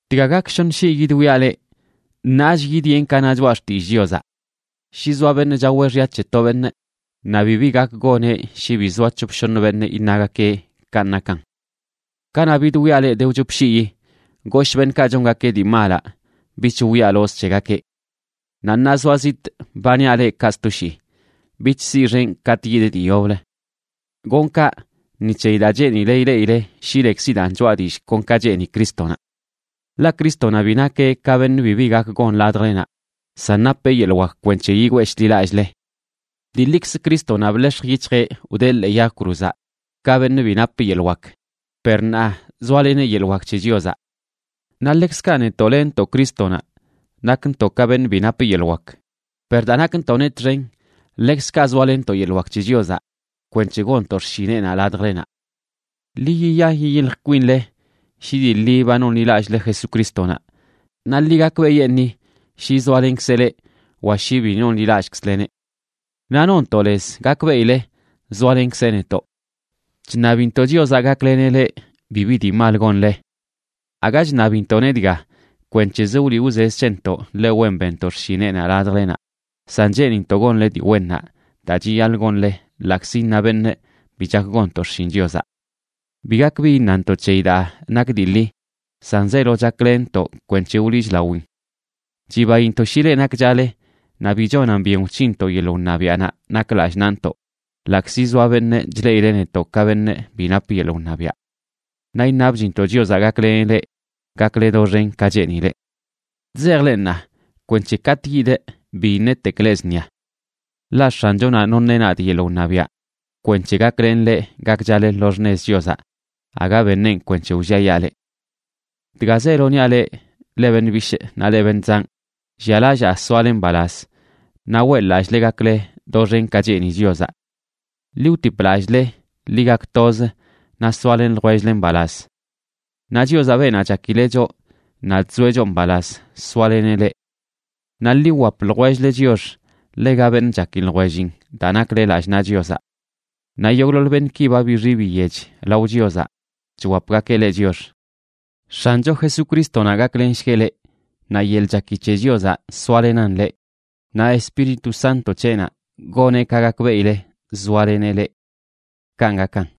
Dga gak shoṉ shii yidwiaꞌ leꞌ. Ṉaach yidyenꞌ ka na choꞌa xtillꞌ Chiozaꞌ: Shi zoa beṉꞌ chaweꞌ xya c̱he to beṉꞌ, naꞌ bibi gak goneꞌ shi bi zoa c̱hop shoṉ beṉꞌ iṉagakeꞌ kanꞌ nakan. Kanaꞌ bidwiaꞌ leꞌ de wchop shiyi, goshꞌ beṉꞌkaꞌ chongakeꞌ dii malaꞌ bich wwialozꞌ c̱hegakeꞌ. Naꞌ ṉaa zoaꞌ zitꞌ, ba niaꞌ leꞌ kaꞌ sto shii, bich siꞌxenꞌ katꞌ yidꞌ dii yoblə. Gonꞌ kaꞌ ni c̱heyi daa cheenile ileꞌile shi lekzidaan choꞌa dillꞌ kon ka cheeni Crístonaꞌ. Ḻaꞌ Crístonaꞌ bi nakeꞌ ka beṉꞌ bibi gak gon ladjlenaꞌ, san napeꞌ yeḻꞌ wak kwenc̱he yigwee shḻi lallꞌle. Dii ḻikzə Crístonaꞌ bḻex̱j yic̱hjeꞌ wdee ḻee yag cruzaꞌ ka beṉꞌ bi nap yeḻꞌ wak, per ṉaa zoaleneꞌ yeḻꞌ wak c̱he Chiozaꞌ. Naꞌ ḻekzkaꞌ netoꞌ lenntoꞌ Crístonaꞌ nakntoꞌ ka beṉꞌ bi nap yeḻꞌ wak, per daa nakntoꞌneꞌ txen ḻekzkaꞌ zoalenntoꞌ yeḻꞌ wak c̱he Chiozaꞌ kwenc̱he gonntoꞌ xshineꞌnaꞌ ladjlenaꞌ. Ḻi yiya yiyilj kwinle shi dii ḻi ba nonḻilallꞌle Jesucrístonaꞌ. Naꞌ ḻi gakbeꞌyeṉii shi zoalenkzeꞌ leꞌ, wa shi bi nonḻilallꞌkzleneꞌ. Naꞌ nontoꞌ lez gakbeꞌile zoalenkzeꞌ netoꞌ. Chṉabintoꞌ Chiozaꞌ gakleneꞌ leꞌ bibi dii mal gonle. Aga chṉabintoꞌneꞌ dga kwenc̱hezə wliꞌ wzez c̱hentoꞌ ḻe wen benntoꞌ xshineꞌnaꞌ ladjlenaꞌ, san cheenintoꞌ gonle dii wennaꞌ daa chiyaḻꞌ gonle ḻaꞌkzi iṉa beṉꞌ bi chak gonntoꞌ xshin Chiozaꞌ. Bi gak bi iṉantoꞌ c̱heyi daa nak dii ḻi, san zeelo chaklenntoꞌ kwenc̱he wliꞌchlawin. Chibaintoꞌ shi leꞌ nakchale naꞌ bi chonan byen wc̱hinntoꞌ yeḻꞌ wṉabiaꞌnaꞌ nak lallꞌ naꞌntoꞌ, ḻaꞌkzi zoa beṉꞌ chleꞌileꞌ netoꞌ ka beṉꞌ bi nap yeḻꞌ wṉabiaꞌ. Naꞌ iṉabchintoꞌ Chiozaꞌ gakleneꞌ leꞌ gakle doxen ka cheenileꞌ. Chzejꞌ leꞌ ṉaa kwenc̱he katꞌ yidꞌ bi iṉetekꞌ leꞌ zṉia. Ḻaꞌ X̱anchonaꞌ noṉeꞌ nadꞌ yeḻꞌ wṉabiaꞌ kwenc̱he gaklenꞌ leꞌ gakchale lo xṉez Chiozaꞌ, aga beṉeꞌn kwenc̱he wlliayaa leꞌ. Dga zeelo niaꞌ leꞌ, leꞌ beṉꞌ bishꞌ naꞌ leꞌ beṉꞌ zanꞌ, llialallaa soale mbalaz naꞌ weꞌḻ-lallꞌle gakle doxen ka cheeni Chiozaꞌ. Ḻi wtip lallꞌle, ḻi gak toz naꞌ soalen ljwell-le mbalaz. Naꞌ Chiozaꞌ, beenaꞌ chakileꞌ choꞌ naꞌ chzoeꞌ choꞌ mbalaz, soaleneꞌ leꞌ. Naꞌ ḻi wwap ljwell-le chiox ḻega beṉꞌ chaki ljwellin daa nakle lallꞌ naꞌ Chiozaꞌ. Naꞌ yogꞌḻoḻ beṉꞌki ba bixi biyech lao Chiozaꞌ chwapgakeꞌ leꞌ chiox. X̱ancho Jesucrístonaꞌ gaklenshgueꞌ leꞌ, naꞌ yeḻꞌ chaki c̱he Chiozaꞌ soalenan leꞌ, naꞌ Espíritu Santo c̱heꞌnaꞌ goneꞌ ka gakbeꞌile zoaleneꞌ leꞌ. Kanꞌ gakan.